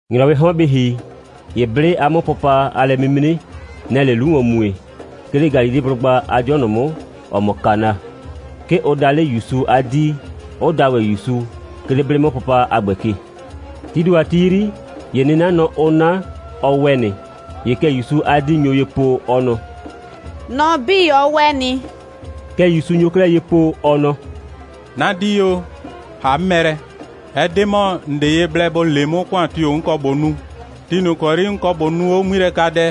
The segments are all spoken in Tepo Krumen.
‑Nyrɔwɩɩ 'hɔn bɩ ‑hi, ‑ye 'blɩ a 'mʋpʋpa a lɛ'mimre, nɛ‑ɛ 'le 'lu ‑wɔn mue, 'ke 'le Galileblʋgba a 'dɩɔ ꞊nʋ 'mʋ, ‑ɔ mɔ Kana. 'Ke ʋ da 'le ‑Yusu a 'dii, 'ʋ da ‑wɛ ‑Yusu, 'ke 'le 'blɩ'mʋpʋpa a ‑gbɛ ke. Tii ‑do a ti 'yri, ‑ye 'nɩnanɔ, ʋʋ 'na, ɔ ‑wɛ nɩ. ‑Ye kɛ ‑Yusu a 'dii nyo ye po, ɔ nɔ: «Nɔ 'bii, ɔ ‑wɛ nɩ.» Kɛ ‑Yusu nyo 'klɛɛ ye po, ɔ nɔ: «'Na 'dii o, ‑ha 'mʋ mɛ lɛ, ɛ 'de ‑mɔ, ‑n 'de ye blɛ ‑bo le 'mʋ, ‑kʋan tio‑ 'n kɔ ꞊bo nu. Ti ꞊nʋ ‑kɔ 'yri 'n kɔ ꞊bo nuu 'o 'ŋmilɛkadɛ,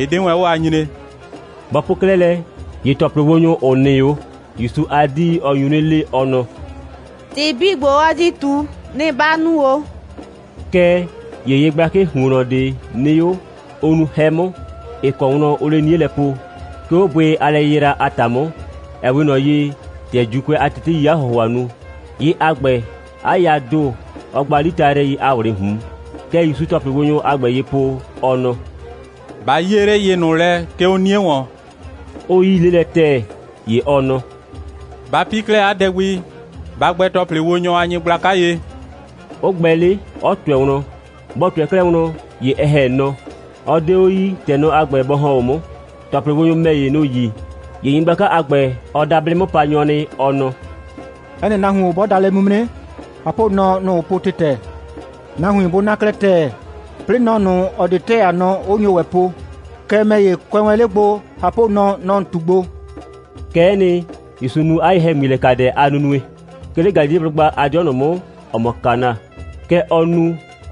ɩ 'de wɛn 'o a nyree.» Bɔ po 'klɛɛ lɛ, ‑ye ‑tɔplɩwonyʋ, ‑ʋ nɩ 'o, ‑Yusu a 'dii, ɔ nyu 'nɩ le, ɔ nɔ: «‑Tɩ 'bii ‑gbo, ɔ di ꞊tu, nɩ‑ ba nu ‑o!» Kɛɛ ‑ye yɩ gblakɩɩ ‑huonnɔ ꞊de nɩ 'o, ʋ nuu 'hɛ 'mʋ, ‑ɩ kɔ wlɔn ʋʋ 'le 'nie lɛ po, 'ke 'o bʋɩ a lɛyɩyra a ‑ta 'mʋ, ‑ɛ 'we ꞊nɔ ye, ‑tɛ ‑Juukʋɛ a teteii 'a ‑hʋhʋa nu. Yɩ a ‑gbɛ, 'a yaa ‑do, ɔɔ gba 'litayrɩɛi a ꞊wlɩɩ ꞊hun. Kɛ ‑Yusuu ‑tɔplɩwonyʋ a ‑gbɛ ye po, ɔ nɔ: «Ba 'yie 'le yɩ ꞊nʋ lɛ, 'ke 'o 'nie ‑wɔn!» 'ʋ 'yii 'le lɛ ‑tɛɛ. ‑Ye ɔ nɔ: «Ba 'pi 'klɛɛ 'a dɛ gbi, ba gbɛ ‑tɔplɩwonyʋ a nyɩgblaka ye!» 'ʋ gbɛ 'le, 'ɔ ꞊tʋɛ wlɔn. Bɔ ꞊tʋɛ 'klɛɛ wlɔn, ‑ye ɛ ‑hɛ nɔ. Ɔ 'de 'o yii, ‑tɛ nɔ a ‑gbɛ bɔ ‑hɔn 'o 'mʋ. ‑Tɔplɩwonyʋ ‑mɛ ‑ye, nʋ‑ yi. ‑Ye nyɩgblaka a ‑gbɛ, ɔ da 'blɩ'mʋpanyɔ nɩ, ɔ nɔ: «'Ɛ nɩ nahuon 'bɔ da lɛ'mimre, ꞊hapʋnɔ, nɔ‑ ʋʋ po ‑tɩtɛ. Nahuin 'bʋ 'na 'klɛɛ ‑tɛɛ, 'plɩɩ nɔ ꞊nʋ, ‑ɔ 'de ‑tɛɛ a nɔ, 'ʋ nyo ‑wɛ po. Kɛɛ, ‑mɛ ‑ye, kʋɛ wɛn 'le gbo, ꞊hapʋnɔ, nɔ‑ ‑n ꞊tu gbo.» Kɛ'ɛ nɩ, ‑Yusu nu 'a ye‑hɛŋmilɛkadɛ a nunue, 'ke 'le Galileblʋgba a 'dɩɔ ꞊nʋ 'mʋ, ‑ɔ mɔ Kana. Kɛ ɔ nu,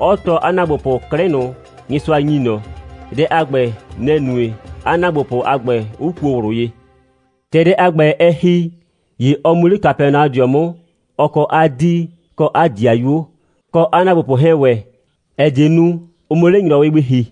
'ɔ tɔɔ 'a ‑naagbopʋ 'klɩ ꞊nʋ, Nyɩsʋa ‑nyi ꞊nɔ. Dɛ a ‑gbɛ, nɛ‑ nue, 'a ‑naagbopʋ a ‑gbɛ 'ʋ kuo ꞊wlʋ ye. ‑Tɛ dɛ a ‑gbɛ, ɛ ‑hi, ‑ye ɔ mu 'le Kapɛnaɔdɩɔ 'mʋ, ɔ kɔ 'a 'dii kɔ 'a ‑dɩayuo, kɔ 'a ‑naagbopʋ 'hɛɛn ‑wɛ, ‑ɛ die nu, ʋ 'mʋ 'le ‑nyrɔwɩ gbi ‑hi.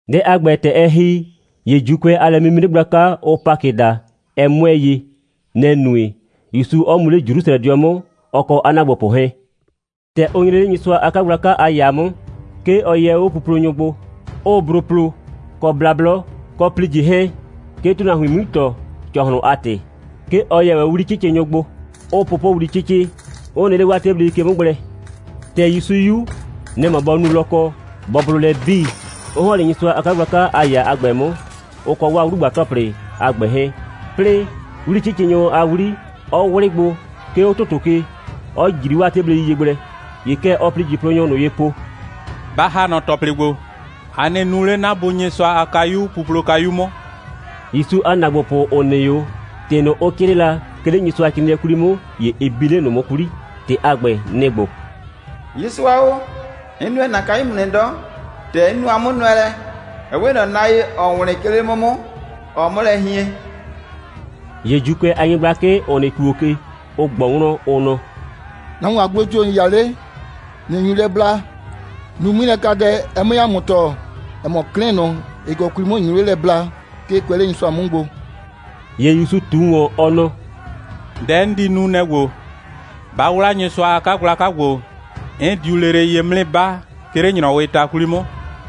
Dɛ a ‑gbɛ, ‑tɛ ɛ ‑hi, ‑ye ‑Juukʋɛ a lɛ'mimre gblaka, ʋʋ Pakɩ daa, ɛ 'mʋɛɛ ye. Nɛ‑ nue, ‑Yusu 'ɔ mu 'le Jrusrɛdɩɔ 'mʋ, ɔ kɔ 'a ‑naagbopʋ 'hɛɛn. ‑Tɛ ʋ nyre 'le Nyɩsʋa a 'kagblaka a ‑yaa 'mʋ, 'ke ɔ yɛ 'o puplonyʋ gbo, 'ʋʋ bro plo, kɔ blablɔ, kɔ ‑plijɩ 'hɛɛn, 'ke ‑tʋnahuin 'mui ‑tɔ, ‑cɔhlʋn a ‑tɩ. 'Ke ɔ yɛ ‑wɛ 'o 'wli'cɩcɩnyʋ gbo, 'ʋʋ pʋpʋwli 'cɩcɩ, 'ʋ nɩ 'le 'waa 'teblei ke 'mʋ gblɛ. ‑Tɛ ‑Yusu 'yu, nɛ‑ mɔ bɔ nu lɔkɔ, bɔ blʋ lɛ 'bii, 'ʋ ‑hɔn 'le Nyɩsʋa a 'kagblaka a ‑yaa a ‑gbɛ 'mʋ, ʋ kɔ 'waa 'wlugba‑tɔplɩ a ‑gbɛ 'hɛɛn, 'plɩɩ, 'wli'cɩcɩnyʋ a 'wli, 'ɔ 'wlɩ gbo, 'ke 'o ‑tʋtʋ ke, 'ɔ ꞊jri 'waa 'teblei ye gblɛ. ‑Ye kɛ ɔɔ ‑plijɩplonyʋ ꞊nʋ ye po: «Ba ‑ha nɔ ‑tɔplɩ ‑gbo! A nɩ nuu 'le 'na Bu Nyɩsʋa a kayu puplokayu 'mʋ!» ‑Yusu a ‑naagbopʋ, ‑ʋ nɩ 'o, ‑tɩ ꞊nʋ, ʋ 'crɩɩ la, 'ke 'le Nyɩsʋacrɩɩnɩɛ 'kwli 'mʋ, ‑ye ɩ bi 'le ꞊nʋ 'mʋ 'kwli. ‑Tɩ a ‑gbɛ, nɩ‑ ‑gbo: «Nyɩsʋa o, 'n nʋɛ ‑na kayu 'mʋ nɩ 'dɔ. ‑Tɛ 'n nu 'a 'mʋnʋɛlɛ, ɛ 'we ꞊nɔ na ye, ‑ɔɔ wlɩn, 'ke 'le 'mʋ 'mʋ, ‑ɔɔ 'mʋ lɛ hien.» ‑Ye ‑Juukʋɛ a nyɩgblakɩ, ‑ʋ nɩ ‑tuo ke, ʋ ꞊gbɔ wlɔn, ʋ nɔ: «Nahuon a gblo tio‑ ‑n 'ya 'le, ꞊nɩ nyu lɛ bla? Nu 'ŋmilɛkadɛ, ɛ 'mue ‑a mʋ tɔɔ, ‑ɛ mɔ, 'klɩ ꞊nʋ, ‑ɩ kɔ 'kwli 'mʋ ‑n nyu 'le lɛ blaa, 'ke ɩ kʋɛ 'le Nyɩsʋa 'mʋ gbo.» ‑Ye ‑Yusu ꞊tu ‑wɔn, ɔ nɔ: «Dɛ 'n di nu, nɛ‑ ‑gbo: Ba 'wla Nyɩsʋa a 'kagblaka ‑gbo, 'n diu lele ye 'mʋ 'nɩ 'ba, 'ke 'le ‑nyrɔwɩɩ ta 'kwli 'mʋ.»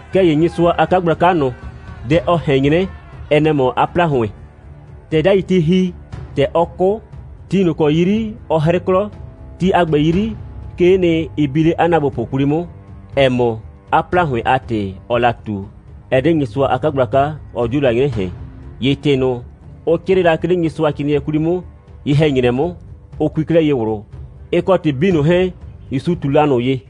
Kɛɛ ‑ye Nyɩsʋa a 'kagblaka ꞊nʋ, dɛ ɔ ꞊hɛn 'nyrɛ, ɛ nɛ‑ mɔ 'a ‑plahʋɩn. ‑Tɛ 'dai ti ‑hi, ‑tɛ ɔ 'kʋ, ti ꞊nʋ ‑kɔ 'yri ɔ 'hrɩ 'klɔ, ti a ‑gbɛ 'yri, 'kee nɩ, ɩ bi 'le 'a ‑naagbopʋ 'kwli 'mʋ, ‑ɛ mɔ, 'a ‑plahʋɩn a ‑tɩ ɔɔ la ꞊tu, ɛ 'de Nyɩsʋa a 'kagblaka, ɔ 'dio la 'nyrɛ ꞊hɛn. ‑Ye ‑tɩ ꞊nʋ, ʋ 'crɩɩ la, 'ke 'le Nyɩsʋacrɩɩnɩɛ 'kwli 'mʋ, ye‑hɛ‑nyrɛ 'mʋ, ʋ kui 'klɛɛ ye ꞊wlʋ, ɩ kɔ ‑tɩ 'bii ꞊nʋ 'hɛɛn, ‑Yusu ꞊tu la ꞊nʋ ye.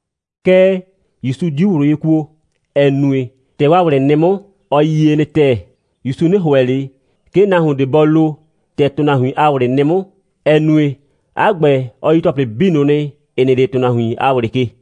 Kɛɛ, ‑Yusu 'diu ꞊wlʋ ye kuo, ‑ɛ nue, ‑tɛ 'waa ꞊wlɩ nɩ 'mʋ, ɔ yie nɩ ‑tɛɛ. ‑Yusu 'nɩ ‑hʋɛ ꞊le, 'ke nahuon ꞊de bɔ lo, ‑tɛ ‑tʋnahuin a ꞊wlɩ nɩ 'mʋ, ‑ɛ nue, 'a ‑gbɛ, ɔ yi ‑tɔplɩ 'bii ꞊nʋ nɩ, ‑ɩ nɩ 'le ‑tʋnahuin a ꞊wlɩ ke.